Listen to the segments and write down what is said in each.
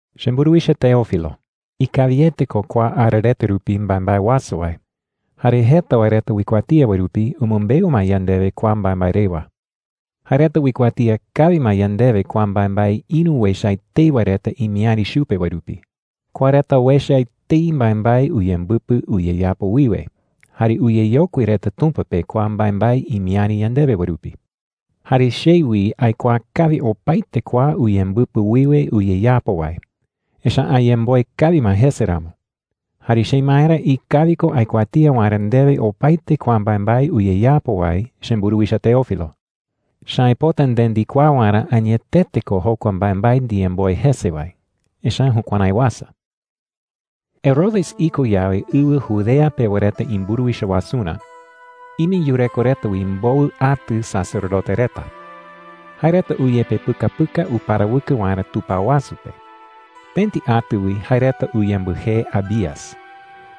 Chemburuwicha Teófilo, ikawiete ko kua ara reta rupi mbaembae uasa wae. Jare jeta wae reta uikuatía wae rupi umɨmbeu ma yandewe kua mbaembae rewa. Jae reta uikuatía kawi ma yandewe kua mbaembae ïru uecha etei wae reta imiäri chupe wae rupi. Kua reta uecha etei mbaembae uyembɨpɨ uyeyapo wiwe, jare uyeyokui reta Tumpa pe kua mbaembae imiäri yandewe wae rupi. Jare che wi aikuaa kawi opaete kua uyembɨpɨ wiwe uyeyapo wae, echa’ä ayemboe kawi ma jese ramo. Jare chemaerä ikawi ko aikuatía waerä ndewe opaete kua mbaembae uyeyapo wae, chemburuwicha Teófilo. Echa’ä aipota nde ndikuaa waerä añetete ko jokua mbaembae ndiyemboe jese wae. Echa’ä jukuärái uasa. Herodes iko yawe ɨwɨ Judea pewa reta imburuwicha wasurä, ime yureko reta wi mbowɨ atɨ sacerdote reta. Jae reta uyepepɨkapɨka uparawɨkɨ waerä tupao wasu pe. Pëti atɨ wi jae reta uyembɨjee Abías.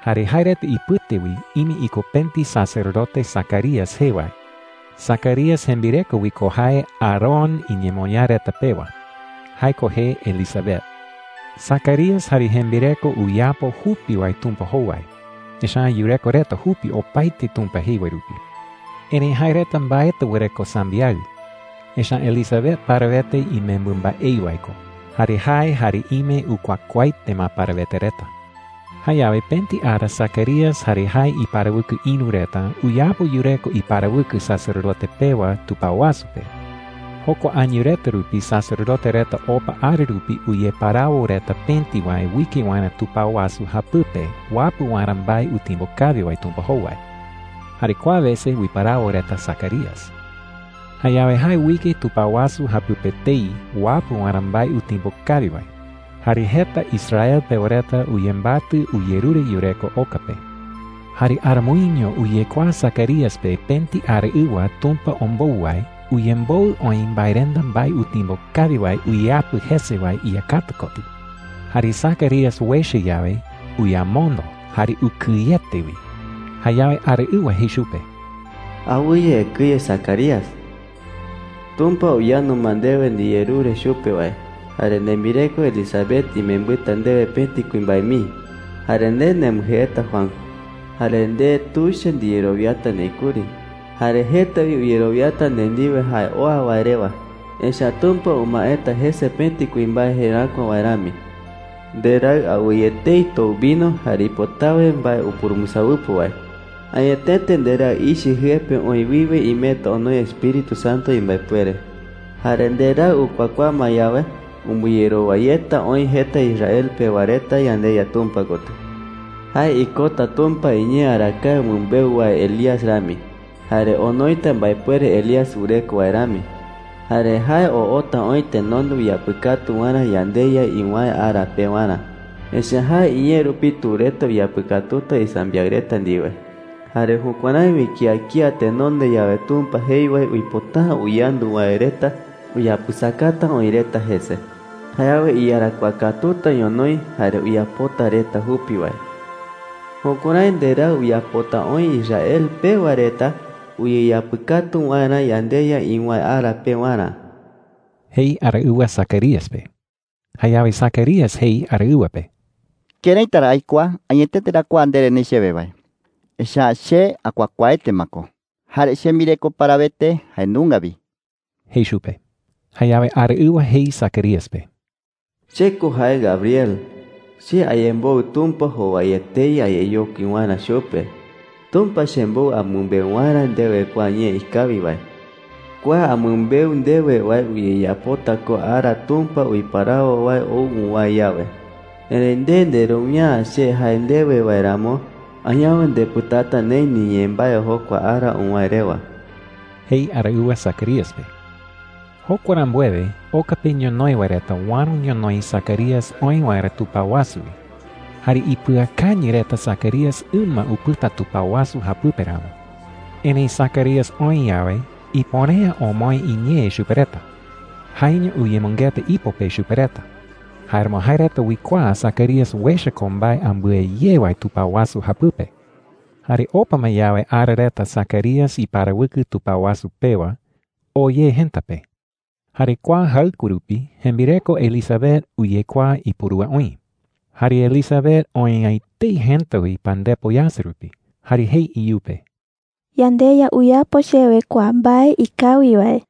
Jare jae reta ipɨte wi ime iko pëti sacerdote Zacarías jee wae. Zacarías jembireko wi ko jae Aarón iñemoñaa reta pewa. Jae ko jee Elisabet. Zacarías jare jembireko uyapo jupi wae Tumpa jowai, echa’ä yureko reta jupi opaete Tumpa jei wae rupi. Erëi jae reta mbaetɨ wɨreko sambiaɨ. Echa’ä Elisabet parawete imembɨ mbaei wae ko. Jare jae jare ime ukuakuaaete ma parawete reta. Jayawe pëti ara Zacarías jare jae iparawɨkɨ ïru reta uyapo yureko iparawɨkɨ sacerdote pewa tupao wasu pe. Jokua año reta rupi sacerdote reta opa ara rupi uyeparawo reta pëti wae uike waerä tupao wasu japɨpe uapɨ waerä mbae utimbo kawi wae Tumpa jowai. Jare kua wese uiparawo reta Zacarías. Jayawe jae uike tupao wasu japɨpe etei uapɨ waerä mbae utimbo kawi wae. Jare jeta Israel pewa reta uyembatɨ uyerure yureko oka pe. Jare aramoiño uyekuaa Zacarías pe pëti araɨwa Tumpa ombou wae uyemboɨ oï mbaerenda mbae utimbo kawi wae uyeapɨ jese wae iyakata kotɨ. Jare Zacarías uecha yawe, uyamondo jare ukɨyete wi. Jayawe araɨwa jei chupe: “Awɨye ekɨye, Zacarías,” jei. “Tumpa uyandu ma ndewe ndiyerure chupe wae, jare nembireko Elisabet imembɨta ndewe pëti kuimbae mii. Jare nde nembɨjeeta Juan,” jei. “Jare nde tuicha ndiyerowiata neï kuri. Jare jeta wi uyerowiata nde ndiwe jae oa wae rewa, echa’ä Tumpa umaeta jese pëti kuimbae jeräkua wae rami,” jei. “Nderaɨ awɨye etei tou vino jare ipotawe mbae upurumbɨsawɨpo wae. Añetete nderaɨ ichɨ jɨe pe oï wiwe imeta onoi Espíritu Santo imbaepuere,” jei chupe. “Jare nderaɨ ukuakuaa ma yawe, umbɨyerowa yeta oï jeta Israel pewa reta yandeYa Tumpa kotɨ. Jae ikota Tumpa iñee arakae umɨmbeu wae Elías rami, jare onoita mbaepuere Elías wɨreko wae rami,” jei. “Jare jae oota oï tenonde uyapɨkatu waerä yandeYa iwäe ara pewarä. Echa’ä jae iñee rupi tu reta uyeapɨkatuta isambiaɨ reta ndiwe. Jare jukuärái wi kía kía tenonde yawe Tumpa jei wae uipota’ä uyandu wae reta uyapɨsakata oï reta jese. Jayawe iyarakuaa katuta ñonoï jare uyapota reta jupi wae,” jei. “Jukuärái nderaɨ uyapota oï Israel pewa reta uyeyapɨkatu waerä yandeYa iwäe ara pewarä,” jei araɨwa Zacarías pe. Jayawe Zacarías jei araɨwa pe: “¿Këraita ra aikuaa añetete ra kua ndere neï chewe wae? Echa’ä che akuakuaaete ma ko jare chembireko parawete jae nunga wi,” jei chupe. Jayawe araɨwa jei Zacarías pe: “Che ko jae Gabriel. Che ayemboɨ Tumpa jowai etei ayeyokui waerä chupe. Tumpa chembou amɨmbeu waerä ndewe kua ñee ikawi wae,” jei chupe. “Kua amɨmbeu ndewe wae uyeyapota ko ara Tumpa uiparawo wae ou uwäe yawe. Erëi nde nderowia’ä che jae ndewe wae ramo, añawe ndepɨtata neï niñee mbae jokua ara uwäe rewa,” jei araɨwa Zacarías pe. Jokua rambuewe oka pe ñonoï wae reta uäro ñonoï Zacarías oë waerä tupao wasu wi. Jare ipɨakañɨ reta Zacarías ɨma upɨta tupao wasu japɨpe ramo. Erëi Zacarías oë yawe, ipuere’ä omoë iñee chupe reta. Jaeño uyemɨngeta ipo pe chupe reta. Jáeramo jae reta uikuaa Zacarías uecha ko mbae ambɨe ye wae tupao wasu japɨpe. Jare opa ma yawe ara reta Zacarías iparawɨkɨ tupao wasu pewa, oo ye jëta pe. Jare kua jaɨkue rupi jembireko Elisabet uyekuaa ipurúa oï. Jare Elisabet oë'ä etei jëta wi pandepo yasɨ rupi. Jare jei iyupe: “YandeYa uyapo chewe kua mbae ikawi wae.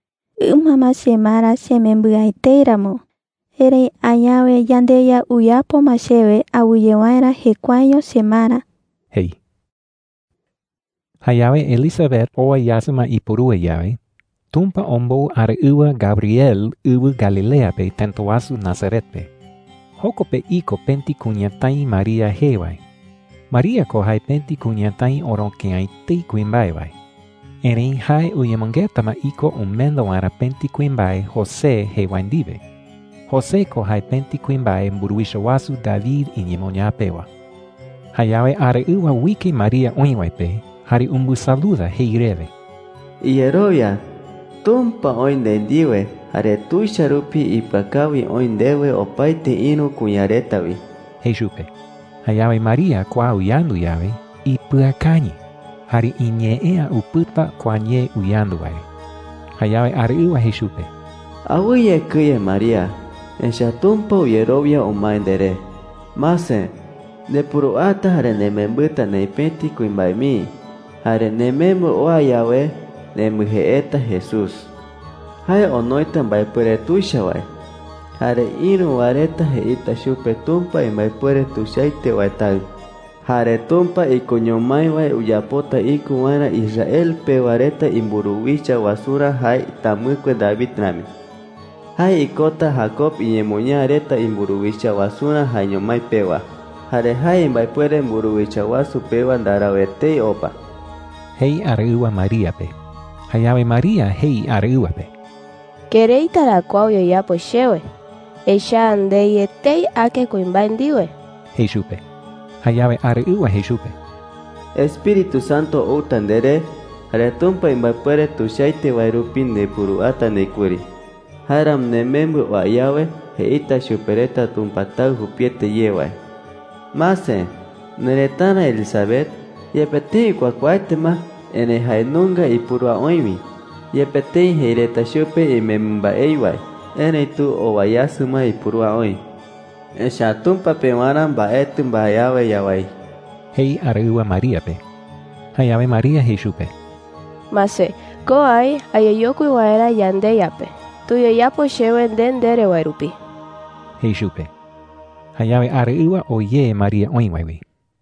Ɨma ma chemara chemembɨ'ä etei ramo. Erëi añawe yandeYa uyapo ma chewe awɨye waerä jekuaeño chemara,” jei. Jayawe Elisabet owa yasɨ ma ipurúa yawe, Tumpa ombou araɨwa Gabriel ɨwɨ Galilea pe tëta wasu Nazaret pe. Joko pe iko pëti kuñatái María jee wae. María ko jae pëti kuñatái oroke’ä etei kuimbae wae. Erëi jae uyemɨngeta ma iko umenda waerä pëti kuimbae José jee wae ndiwe. José ko jae pëti kuimbae mburuwicha wasu David iñemoñaa pewa. Jayawe araɨwa uike María oï wae pe jare umbɨsaluda jei rewe: “Iyerowia. Tumpa oï nde ndiwe jare tuicha rupi ipɨakawi oï ndewe opaete ïru kuña reta wi,” jei chupe. Jayawe María kua uyandu yawe, ipɨakañɨ jare iñee’ä upɨta kua ñee uyandu wae re. Jayawe araɨwa jei chupe: “Awɨye ekɨye, María. Echa’ä Tumpa uyerowia umae nderé,” jei chupe. “Mase, ndepuruata jare nemembɨta neï pëti kuimbae mii. Jare nemembɨ oa yawe, nembɨjeeta Jesús. Jae onoita mbaepuere tuicha wae, jare ïru wae reta jeita chupe Tumpa imbaepuere tuichaete wae Taɨ. Jare Tumpa ikoño mái wae uyapota iko waerä Israel pewa reta imburuwicha wasurä jae tamɨkue David rami,” jei chupe. “Jae ikota Jacob iñemoñaa reta imburuwicha wasurä jaeño mái pewa. Jare jae imbaepuere mburuwicha wasu pewa ndarau etei opa,” jei araɨwa María pe. Jayawe María jei araɨwa pe: “¿Këraita ra kua uyeyapo chewe? Echa’ä ndei etei ake kuimbae ndiwe,” jei chupe. Jayawe araɨwa jei chupe: “Espíritu Santo outa nderé, jare Tumpa imbaepuere tuichaete wae rupi ndepuruata neï kuri. Jáeramo nemembɨ oa yawe, jeita chupe reta Tumpa Taɨ jupiete ye wae,” jei chupe. “Mase, nerëtara Elisabet, yepe tëi ukuakuaaete ma, erëi jae nunga ipurúa oï wi. Yepe tëi jei reta chupe imembɨ mbaei wae, erëitu owa yasɨ ma ipurúa oï. Echa’ä Tumpa pewarä mbaetɨ mbae awe yawái,” jei araɨwa María pe. Jayawe María jei chupe: “Mase, ko aï ayeyokui waerä yandeYa pe. Tuyeyapo chewe nde ndere wae rupi,” jei chupe. Jayawe araɨwa oo ye María oï wae wi.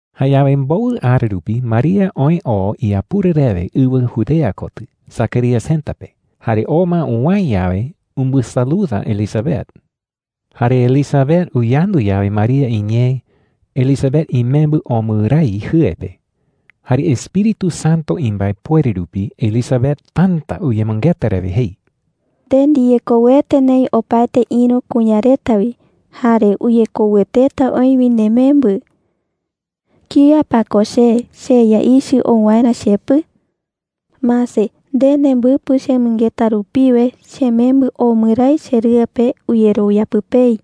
Jayawe mbowɨ ara rupi María oë oo iapura rewe ɨwɨ Judea kotɨ Zacarías jëta pe. Jare oo ma uwäe yawe, umbɨsaluda Elisabet. Jare Elisabet uyandu yawe María iñee, Elisabet imembɨ omɨ raí jɨe pe. Jare Espíritu Santo imbaepuere rupi Elisabet täta uyemɨngeta rewe jei: “¡Nde ndiyekouete neï opaete ïru kuña reta wi! ¡Jare uyekoueteta oï wi nemembɨ!” jei. “¿Kía pa ko che, cheYa ichɨ ou waerä chepɨ?” jei. “Mase, nde nembɨpɨ chemɨngeta rupiwe, chemembɨ omɨ raí cherɨe pe uyerowia pɨpei,” jei.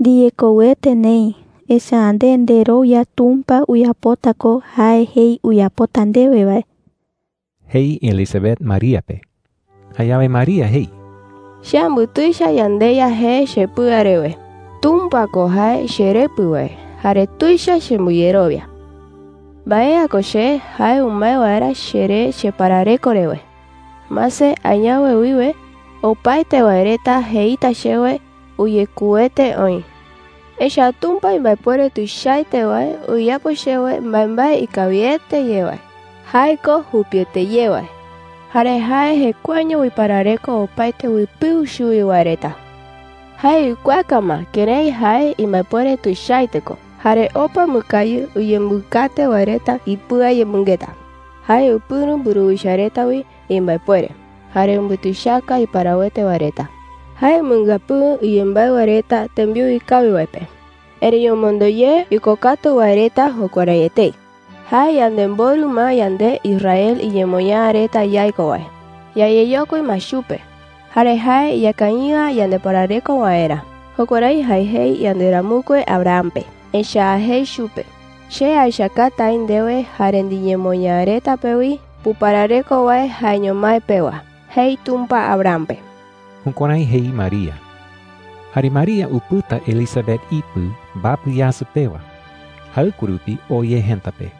“Ndiyekouete neï, echa’ä nde nderowia Tumpa uyapota ko jae jei uyapota ndewe wae,” jei Elisabet María pe. Jayawe María jei: “Che ambutuicha yandeYa jee chepɨa rewe. Tumpa ko jae cheRepɨ wae jare tuicha chembɨyerowia. Mbae’ä ko che, jae umae waerä cheré cheparareko rewe. Mase, añawe wiwe opaete wae reta jeita chewe: ‘Uyekouete oï.’ Echa’ä Tumpa imbaepuere tuichaete wae uyapo chewe mbaembae ikawiete ye wae. Jae ko jupiete ye wae. Jare jae jekuaeño uiparareko opaete uipɨu chuwi wae reta. Jae uikuaaka ma kërái jae imbaepuere tuichaete ko. Jare opa umɨkañɨ uyembɨkate wae reta ipɨayemɨngeta. Jae upɨ̈ro mburuwicha reta wi imbaepuere, jare umbutuichaka iparawete wae reta. Jae umɨngapɨɨ iyembaɨ wae reta tembiu ikawi wae pe. Erëi omondo ye ikokatu wae reta jukuärái etei. Jae yanemborɨ ma yande Israel iñemoñaa reta yaiko wae. Yayeyokui ma chupe, jare jae iñakañɨ'ä yandeparareko waerä. Jukuärái jae jei yanderamɨkue Abraham pe. Echa’ä jei chupe: ‘Che aechakata aï ndewe jare niñemoñaa reta pe wi puparareko wae jaeño mái pewa,’ jei Tumpa Abraham pe.” Jukuärái jei María. Jare María upɨta Elisabet ipɨ mbapɨ yasɨ pewa. Jaɨkue rupi oo ye jëta pe.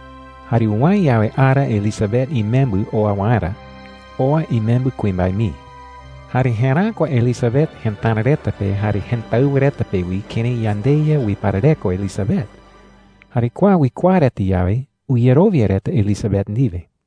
Jare uwäe yawe ara Elisabet imembɨ oa waerä, oa imembɨ kuimbae mii. Jare jeräkua Elisabet jëtara reta pe jare jëtáɨwa reta pe wi kërái yandeYa uiparareko Elisabet. Jare kua uikuaa reta yawe, uyerowia reta Elisabet ndiwe.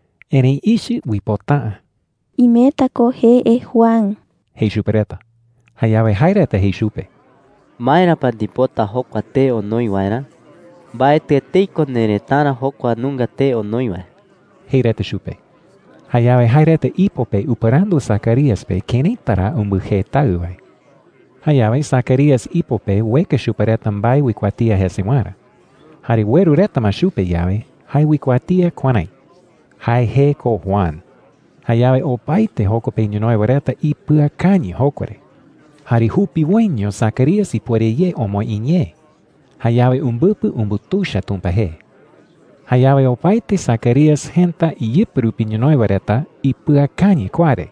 Erëi ichɨ uipota’ä. “Imeta ko jee Juan,” jei chupe reta. Jayawe jae reta jei chupe: “¿Maera pa ndipota jokua tee onoi waerä? Mbaetɨ etei ko nerëtara jokua nunga tee onoi wae,” jei reta chupe. Jayawe jae reta ipo pe upɨrandu Zacarías pe këraita ra umbɨjee taɨ wae. Jayawe Zacarías ipo pe ueka chupe reta mbae uikuatía jese waerä. Jare ueru reta ma chupe yawe, jae uikuatía kuärái: “Jae jee ko Juan.” Jayawe opaete joko pe ñonoï wae reta ipɨakañɨ jokua re. ¡Jare jupiwoiño Zacarías ipuere ye omoë iñee! Jayawe umbɨpɨ umbutuicha Tumpa jee. Jayawe opaete Zacarías jëta iyɨpɨ rupi ñonoï wae reta ipɨakañɨ kua re.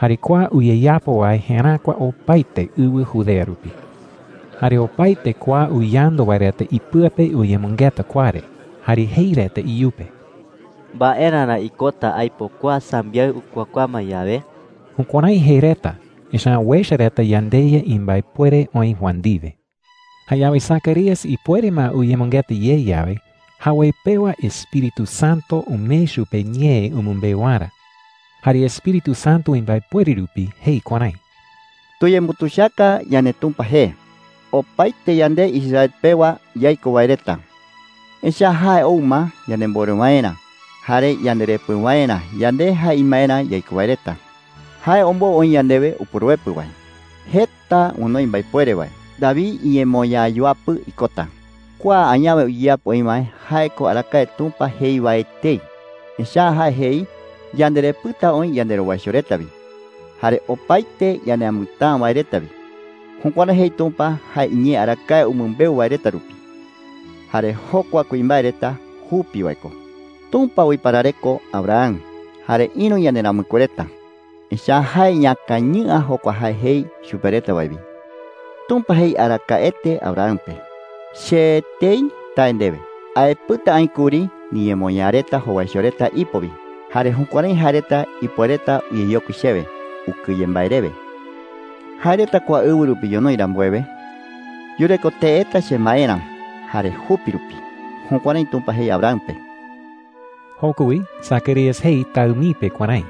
Jare kua uyeyapo wae jeräkua opaete ɨwɨ Judea rupi. Jare opaete kua uyandu wae reta ipɨa pe uyemɨngeta kua re, jare jei reta iyupe: “¿Mbaerä ra ikota aipo kua sambiaɨ ukuakuaa ma yawe?” Jukuärái jei reta, echa’ä uecha reta yandeYa imbaepuere oï Juan ndiwe. Jayawe Zacarías ipuere ma uyemɨngeta ye yawe, jawoi pewa Espíritu Santo umee chupe ñee umɨmbeu waerä. Jare Espíritu Santo imbaepuere rupi jei kuärái: “¡Tuyembutuichaka yandeTumpa jee opaete yande Israel pewa yaiko wae reta! Echa’ä jae ou ma yanemborɨ waerä jare yanderepɨ waerä, yande jae imaerä yaiko wae reta. Jae ombou oï yandewe Upuruepɨ wae jeta onoi mbaepuere wae. David iñemoñaa yuapɨ ikota. Kua añawe uyeyapo oï wae, jae ko arakae Tumpa jei wae etei. Echa’ä jae jei yanderepɨta oï yanderowaicho reta wi jare opaete ñaneamɨtäa wae reta wi. Jukuärái jei Tumpa jae iñee arakae umɨmbeu wae reta rupi. Jare jokua kuimbae reta jupi wae ko. Tumpa uiparareko Abraham jare ïru yanderamɨkue reta, echa’ä jae iñakañɨ'ä jokua jae jei chupe reta wae wi. Tumpa jei arakaete Abraham pe: ‘Che etei tae ndewe, aepɨta aï kuri niñemoñaa reta jowaicho reta ipo wi. Jare jukuärái jae reta ipuereta uyeyokui chewe ukɨye mbae rewe. Jae reta kua ɨwɨ rupi ñonoï rambuewe, yureko teeta chemaerä jare jupi rupi.’ Jukuärái Tumpa jei Abraham pe.” Joko wi Zacarías jei taɨ mii pe kuärái: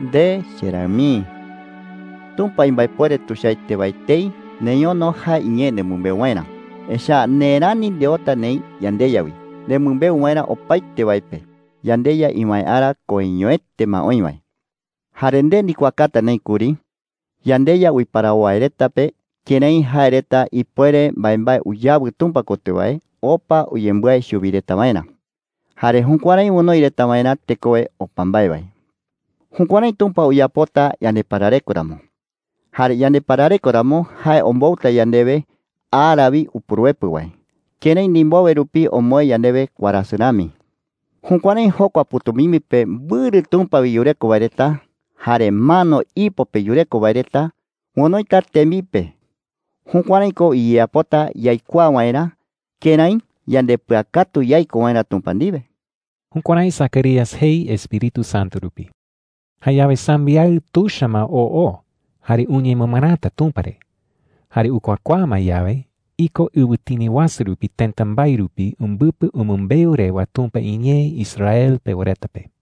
“Nde, cheraɨ mii,” jei chupe. “Tumpa imbaepuere tuichaete wae etei neñono jae iñee nemɨmbeu waerä. Echa’ä nde rani ndeota neï yandeYa wi nemɨmbeu waerä opaete wae pe yandeYa iwäe ara koiñoete ma oï wae. Jare nde ndikuaakata neï kuri yandeYa uiparawo wae reta pe kërái jae reta ipuere mbaembae uyawɨ Tumpa kotɨ wae opa uyembái chuwi reta waerä, jare jukuärái onoi reta waerä tekowe opa mbae wae. Jukuärái Tumpa uyapota yandeparareko ramo. Jare yandeparareko ramo, jae ombouta yandewe ara wi Upuruepɨ wae, kërái ndimbowe rupi omoë yandewe warasɨ rami. Jukuärái jokua pɨ̈tumimbi pe mbɨrɨ Tumpa wi yureko wae reta jare mano ipo pe yureko wae reta onoita tembipe. Jukuärái ko uyeyapota yaikuaa waerä kërái yandepɨakatu yaiko waerä Tumpa ndiwe.” Jukuärái Zacarías jei Espíritu Santo rupi. Jayawe sambiaɨ tuicha ma oo oo jare uñemɨmɨräta Tumpa re. Jare ukuakuaa ma yawe, iko ɨwɨtini wasu rupi tëta mbae rupi umbɨpɨ umɨmbeu rewa Tumpa iñee Israel pewa reta pe.